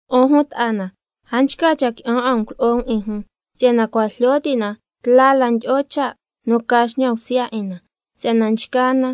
'Un jun ta'a na, a nchca cha' qui'an 'a um culo'o um 'in jun, si'yana cua' jlyo ti' na tla la ndyi'o cha' nu ca xñan bsya 'in na. Si'yana nchgaa na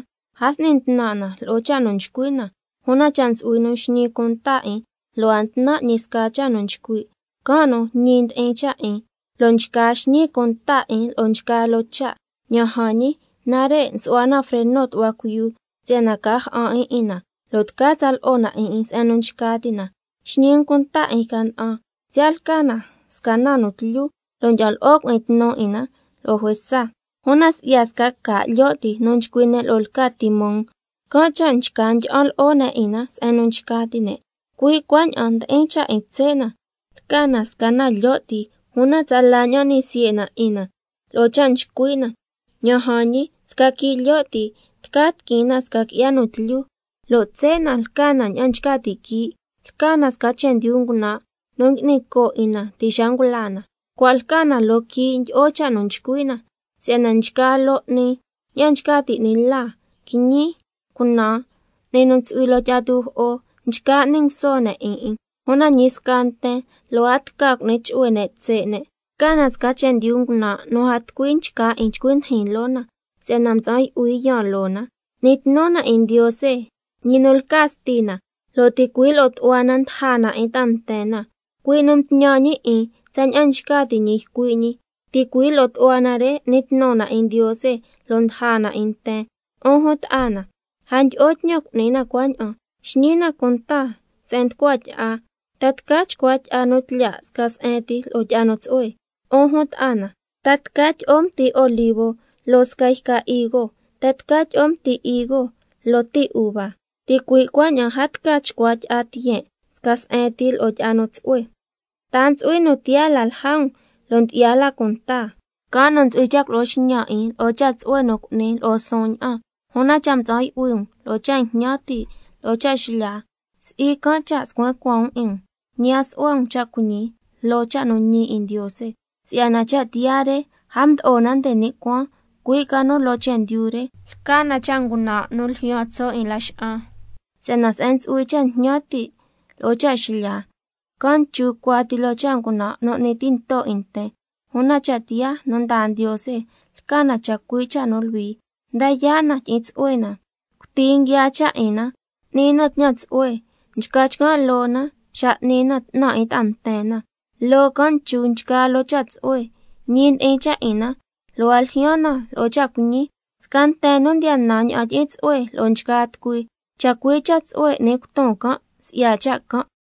a s'ni ntnan' na lo'o cha' nu nchcui' na. Una cha' ntsu'hui nu nxñi cunta 'in lo' a ntnan' ñi sca cha' nu nchcui', can' nu ñi ndi'in cha' 'in lo' nchca xñi cunta 'in lo'o nchgaa loo cha'. Ña'an jan ñi, nare' nsu'hua na freno tu'hua cuiyu si'yana ca ja'an 'in 'in na, lo' tca tsa lo'o na 'in 'in se'en nu nchca ti' na. Xñi um cunta 'in yca na'an, siya' lca na sca na nu tlyu lo' ndyi'an lo'o cui'in tnu 'in na lo'o juesa, una si'ya sca ca' lyo' ti nu nchcui' ne' lo'o lca timón, can' cha' nchca ndyi'an lo'o ne' 'in na se'en nu nchca ti' ne'. Cui' cuaña'an ndi'in cha' 'in tse' na, lca na sca na lyo' ti, una tsala ña'an n'ni siye' na 'in na lo'o cha' nchcui' na. Ña'an jan ñi, sca quii' lyo' ti lo' tca tiquin na sca qui'ya nu tlyu. Lo' tse' na lca na ña'an nchca ti' quii', lca na sca chendyu ngunan' nu ngui'ni coo' 'in na ti' xa ngula na, cua' lca na loo quii' ndyi'o cha' nu nchcui' na. Si'yana nchgaa loo 'ni, ña'an nchca ti' 'ni la, quiñi, cunaan, 'ni nu ntsu'hui loo tyi'a tujo'o, nchca n'ni nguso ne' 'in 'in. una ñi sca nten lo' a tca cu'ni chu'hue ne' tse' ne', lca na sca chendyu ngunan' nu a tucui nchca 'in chcui ndijin loo na, si'yana mtsa'an yu'hui yaan loo na. N'ni tnu na 'in Ndiose, ñi nu lca Stina, lo' ticui' lo'o tu'hua na ndaja na 'in ta'a nten na, cui' nu mtñan ñi tsaña'an nchca ti' ñi ycui' ñi. Ticui' lo'o tu'hua na re n'ni tnu na 'in Ndiose lo' ndaja na 'in nten. 'Un jun ta'a na, a ndyi'o tñan cu'ni na cuaña'an. Xñi na cunta se'en nducua tyi'a, ¿ta tca chcua tyi'a nu tlyaa' sca se'en ti lo'o tyi'a nu tsu'hue? 'Un jun ta'a na, ¿ta tca tyi'o mti olivo loo sca yca higo? ¿Ta tca tyi'o mti higo loo ti uva? Ticui' cuaña'an a tca chcua tyi'a tiyen' sca se'en ti lo'o tyi'a nu tsu'hue. ¿Ta a ntsu'hui nu tiyaa la lja um lo' ndyi'ya la cunta? Can' nu ntsu'hui cha' culo'o xñan 'in lo'o cha' tsu'hue nu cu'ni, lo'o suun ña'an. Una cha' mtsa'an yu'hui um lo'o cha' jñan ti' lo'o cha' xlya, si'i can' cha' scuen cuaan um 'in um, ñi a su'hua um cha' cuiñi loo cha' nu ñi 'in Ndiose. Si'yana cha' tiyaa re a mdo'o na nde ni' cuaan, cui' ca nu loo chendyu re, lca na cha' ngunan' nu ljyaan tso' 'in laxa'an. Si'yana se'en ntsu'hui cha' jñan ti' lo'o cha' xlya, can' nchu cuati loo cha' ngunan' nu n'ni tinto 'in nten. Una cha' tiyaa nu ndaa Ndiose lca na chacui' cha' nu luhui, nda yaa' na tyi'in tsu'hue na, cuti nguiaa cha' 'in na, n'ni na tñan tsu'hue, nchca chcan' loo na xa n'ni na 'tnan 'in ta'a nten na, loo can' nchu nchgaa loo cha' tsu'hue, ñi ndi'in cha' 'in na lo' a ljyaan na lo'o cha' cuiñi. Sca nten nu ndiya nan ña'an tyi'in tsu'hue lo'o nchgaa tucui, chacui' cha' tsu'hue n'ni cuton can' si'ya cha' can'.